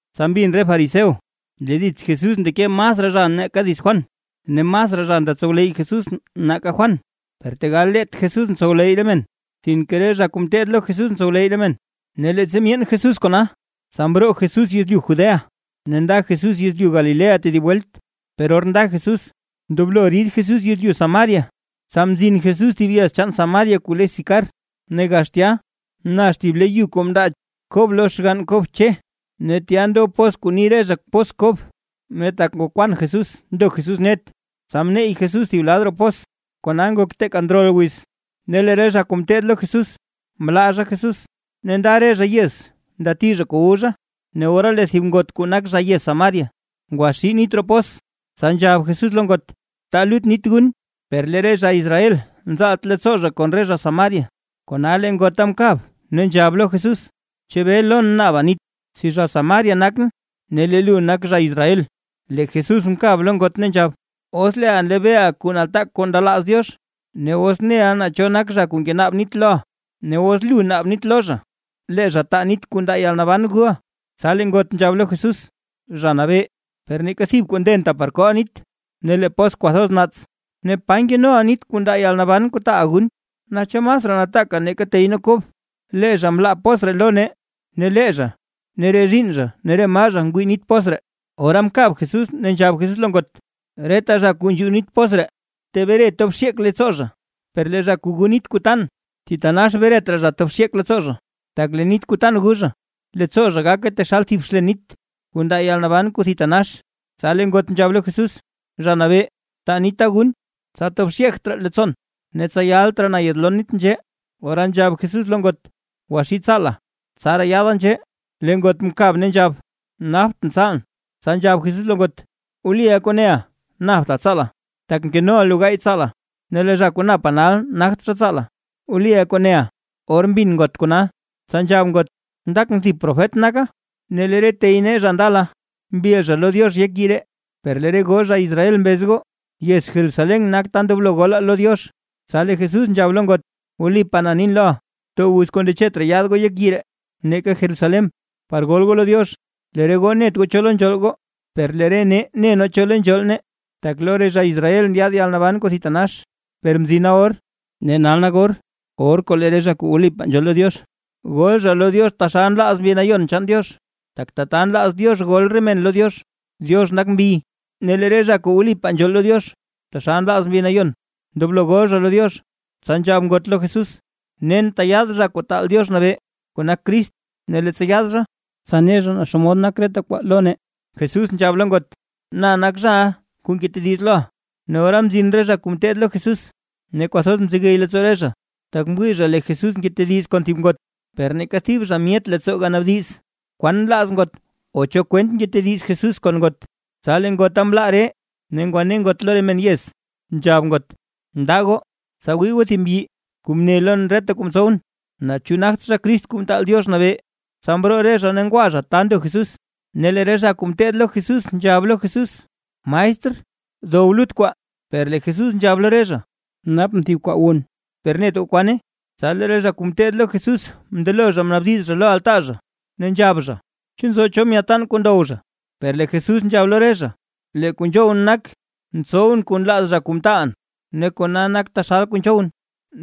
Tsa mbin re fariseo lee dits Jesús ndeke masraa zha nake dits Juan, ne masraa zha nda ntsowleyy Jesús nake Juan. Per tegal leet Jesús ntsowleyy re men, sinke re zha kuu ngeteed lo Jesús ntsowleyy re men. Ne leettsa myeen Jesús kona, tsa mroo Jesús yezlyu Judea ne nda Jesús yezlyu Galilea tedib welt. Per or nda Jesús, ndoblo rid Jesús yezlyu Samaria. Tsa mzin Jesús thib yez chaan Samaria kuu le Sicar, ne gax tya nax thib le yu kuu mndaa Kob lo Che xgann Kob. Ne tya ndob pos kuu ni re zha pos Kob. Ne tak ngokwan Jesús ndo Jesús net, tsa mneyy Jesús thib lad roo pos. Kona ngok teeka ndrol wiz. Ne lee re zha kuu ngeteed lo Jesús, mlaa zha Jesús, ne nda re zha yez ndati zha kuu wu zha. Ne ora lee thib ngot kuu nak zha yez Samaria ngwaxii nit roo pos, tsa nzhab Jesús lo ngot: ―Taa lut nit gun. Per lee re zha Israel nzaalt leettsoo kon re zha Samaria, kona lee ngota mkab, ne nzhab lo Jesús: ―¿Chebee lon naaba nit, si zha Samaria nakʼn ne lee lu nak zha Israel? Lee Jesús mkab lo ngot ne nzhab: ―Os leeʼa nlebeeʼa kuu nataak kuu ndelaaz Diox, ne os neʼa naa cho nak zha kuu ngenaab nit loʼa, ne os lu naaba nit lo zha, lee zha taa nit kuu ndaa yalnaban guʼa. Tsa lee ngot nzhab lo Jesús: ―Zha Nabee, per neeka thib kuu ndenta par kooʼa nit, ne lee pos kwathoz naats, ¿ne pa nkenoʼa nit kuu ndaa yalnaban kuu taaʼa gun? Naa ¿chu masraa nataaka nake tey nee Kob? Lee zha mlaa pos ree lo nee, ne lee zha, re zhiinn zha ne re maa zha ngwii nit pos ree. Ora mkab Jesús ne nzhab Jesús lo ngot: ―Reta zha kuu nzhuu nit pos ree, tebre tob xyeek leettsoo zha, per lee zha kuu gu nit kuu tan, thitanax bret raa zha tob xyeek leettsoo zha, tak lee nit kuu tan gu zha, leettsoo zha gake taxal thib xlen nit, kuu ndaa yalnaban kuu thitanax. Tsa lee ngot nzhab lo Jesús: ―Zha Nabee, taa nita gun, tsa tob xyeegt raa leettsoon, ne tsa yalt raa na yaadlon nit nzhee. Ora nzhab Jesús lo ngot: ―Gwa gwaxii tsaala, tsaraa yaada nzhee. Lee ngot mkab ne nzhab: ―Naptʼn tsaalʼn. Tsa nzhab Jesús lo ngot: ―Wliʼa kuu neʼa, napta tsaala, tak mkenoʼa lu gaay tsaala, ne lee zha kuu napa nal, nagt zha tsaala, wliʼa kuu neʼa. Or mbin ngot kona, tsa nzhab ngot: ―Ndakʼn thib profet naka. Lee re tey nee zha ndala mbil zha lo Diox yek yii ree, per lee re goo zha Israel mbez goo, yez Jerusalén nak ta ndoblo golaa lo Diox. Tsa lee Jesús nzhab lo ngot: ―Wlipaa na nin loʼa, too wiz kuu ndechet raa yaad goo yek yii ree, neeka Jerusalén, par gol goo lo Diox. Lee re goo net goo cho lo nzhool goo, per lee re nee ne nee cho lo nzhool nee, tak lo re zha Israel ndyaad yalnaban kuu thitanax. Per mzina or, ne nal nak or kuu lee re zha kuu wlipaa nzhool lo Diox, gol zha lo Diox taxal nlaaz Mbi Nayon chaan Diox. Tak tata nlaaz Diox gol re men lo Diox. Diox nak mbi, ne lee re zha kuu wlipaa nzhool lo Diox, taxal nlaaz Mbi Nayon, ndoblo gol zha lo Diox. Tsa nzhab ngot lo Jesús: ―Nen tyaad Zha Kuu taal Diox Nabee (kuu nak Crist), ne leettsa yaad zha, tsa ne zha naa xomod nak reta kwaa lo nee. Jesús nzhab lo ngot: ―¡Na nak zhaʼa, kuu ngetediz loʼa! Ne ora mzin re zha kuu ngeteed lo Jesús, ne kwathoz mzegey leettsoo re zha, tak mwii zha lee Jesús ngetediz kon thib ngot, per neeka thib zha myet leettsoo ganaabdiz, kwan nlaaz ngot o cho kwent ngetediz Jesús kon ngot. Tsa lee ngota mlaa ree, ne ngwane ngot lo re men yez, nzhab ngot: ―Ndaa goo, tsa wii goo thib mbyi, kuu mne lon reta kuu mtsowʼn. ¿Naa chu nagt zha Crist Kuu Mtaal Diox Nabee? Tsa mroo re zha ne ngwa zha ta ndo Jesús. Ne lee re zha kuu ngeteed lo Jesús, nzhab lo Jesús: ―Maestr, dow lut kwaa. Per lee Jesús nzhab lo re zha: ―Napʼn thib kwaa wun, per net goo kwane. Tsa lee re zha kuu ngeteed lo Jesús mndelo zha mnaabdiz zha lo altaa zha, ne nzhab zha: ―¿Chu nzo cho myaadtaan kuu ndow zha? Per lee Jesús nzhab lo re zha: ―Lee kuu nzhowʼn nak, ntsowʼn kuu nlaaz zha kuu mtaalʼn, ne kona nak taxal kuu nzhowʼn,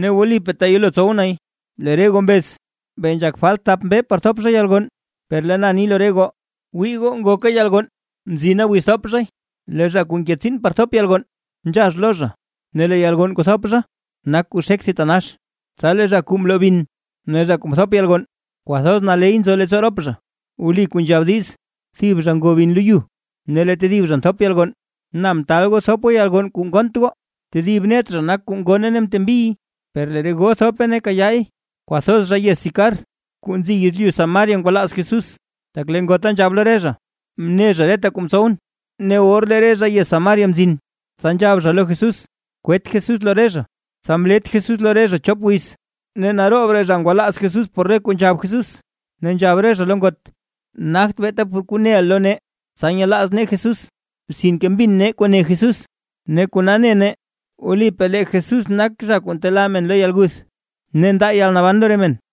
ne wlipaa teyelo tsow nay. Lee re goo mbez: “Bee nzhak falt thap mbee par thop zha yalgonn”, per lee na ni lo re goo, wii goo, ngoka yalgonn ne mzina wiz thop zhay. Lee zha kuu nke tsiin par thop yalgonn, nzhax lo zha, ne lee yalgonn kuu nthop zha, nak kuu xek thitanax, tsa lee zha kuu mloo bin, ne zha kuu mthop yalgonn kwathoz naley nzo leettsoo rop zha. Wli kuu nzhab diiz: “Thib zha ngo bin lo yu ne lee tedib zha nthop yalgonn”. Na mtaal goo thop goo yalgonn kuu ngonnt goo, tedib net zha nak zha kuu ngonne ne mtembiy, per lee re goo thope ne kayaay. Kwathoz zha yez Sicar kuu nzi yezlyu Samaria ngwalaaz Jesús, tak lee ngota nzhab lo re zha: “Mne zha reta kuu mtsowʼn”. Ne or lee re zha yez Samaria mzin, tsa nzhab zha lo Jesús, kwet Jesús lo re zha. Tsa mlet Jesús lo re zha chop wiz, ne naroob raa zha ngwalaaz Jesús por re kuu nzhab Jesús. Ne nzhab re zha lo ngot: ―Nagt beeta por kuu neʼa lo nee, tsa nyelaaz nee Jesús, sinke mbina nee kuu ne Jesús, ne kona ne nee wlipaa lee Jesús nak zha kuu ntelaa re men lo yalguth ne ndaa yalnaban lo re men.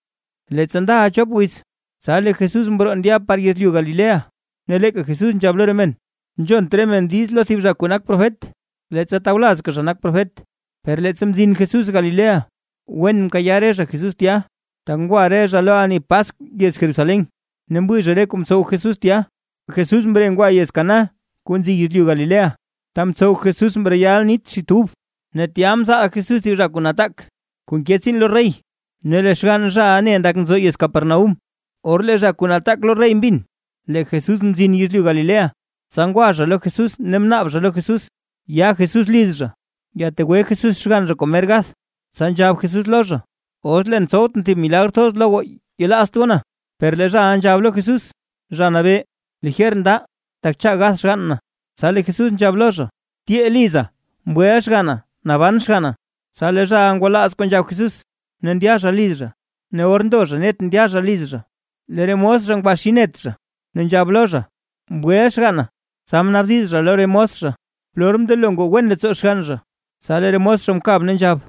Leettsa ndaʼa chop wiz, tsa lee Jesús mroo ndya par yezlyu Galilea. Ne leeka Jesús nzhab lo re men, nzhont re men diiz lo thib zha kuu nak profet, leettsa tawlazka zha nak Profet. Per leettsa mzin Jesús Galilea, wen mkayaa re zha Jesús tya, tak ngwa re zha lo ani Paskw yez Jerusalén, ne mwii zha re kuu mtsow Jesús tya. Jesús mre ngwa yez Caná kuu nzi yezlyu Galilea, ta mtsow Jesús mreyal nit xit ub. Ne tya mzaal Jesús thib zha kuu nataak kuu nke tsiin lo rey, ne lee xgann zhaʼa ne ndak nzo yez Capernaúm. Or lee zha kuu nataak lo rey mbin lee Jesús mzin yezlyu Galilea, tsa ngwa zha lo Jesús ne mnaab zha lo Jesús, ya Jesús liz zha, yategwe Jesús xgann zha kuu mer gath. Tsa nzhab Jesús lo zha: ―Os leen tsowtʼn thib re milagr thoz lo goo, yelaazt goo na. Per lee zhaʼa nzhab lo Jesús: ―Zha Nabee, lijer ndaa tak cha gath xgann na. Tsa lee Jesús nzhab lo zha: ―Tyee liza, ¡mgweʼa xganna, naban xganna! Tsa lee zhaʼa ngwalaaz kuu nzhab Jesús ne ndya zha liz zha. Ne or ndo zha net ndya zha liz zha, lee re mos zha ngwaxii net zha, ne nzhab lo zha: ―¡Mgweʼa xganna! Tsa mnaabdiz zha lo re mos zha, polor mndelo ngoo wen leettsoo xgann zha, tsa lee re mos mkab ne nzhab: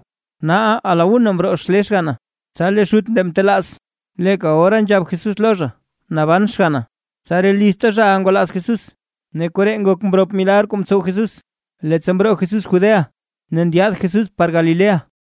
―Naaʼa a la una mroo xlee xganna. Tsa lee xut ndeʼa mtelaaz, leeka ora nzhab Jesús lo zha “naban xganna”. Tsa re lizta zhaʼa ngwalaaz Jesús. Ne koree ngok mrop milagr kuu mtsow Jesús, leettsa mroo Jesús Judea ne ndyaad Jesús par Galilea.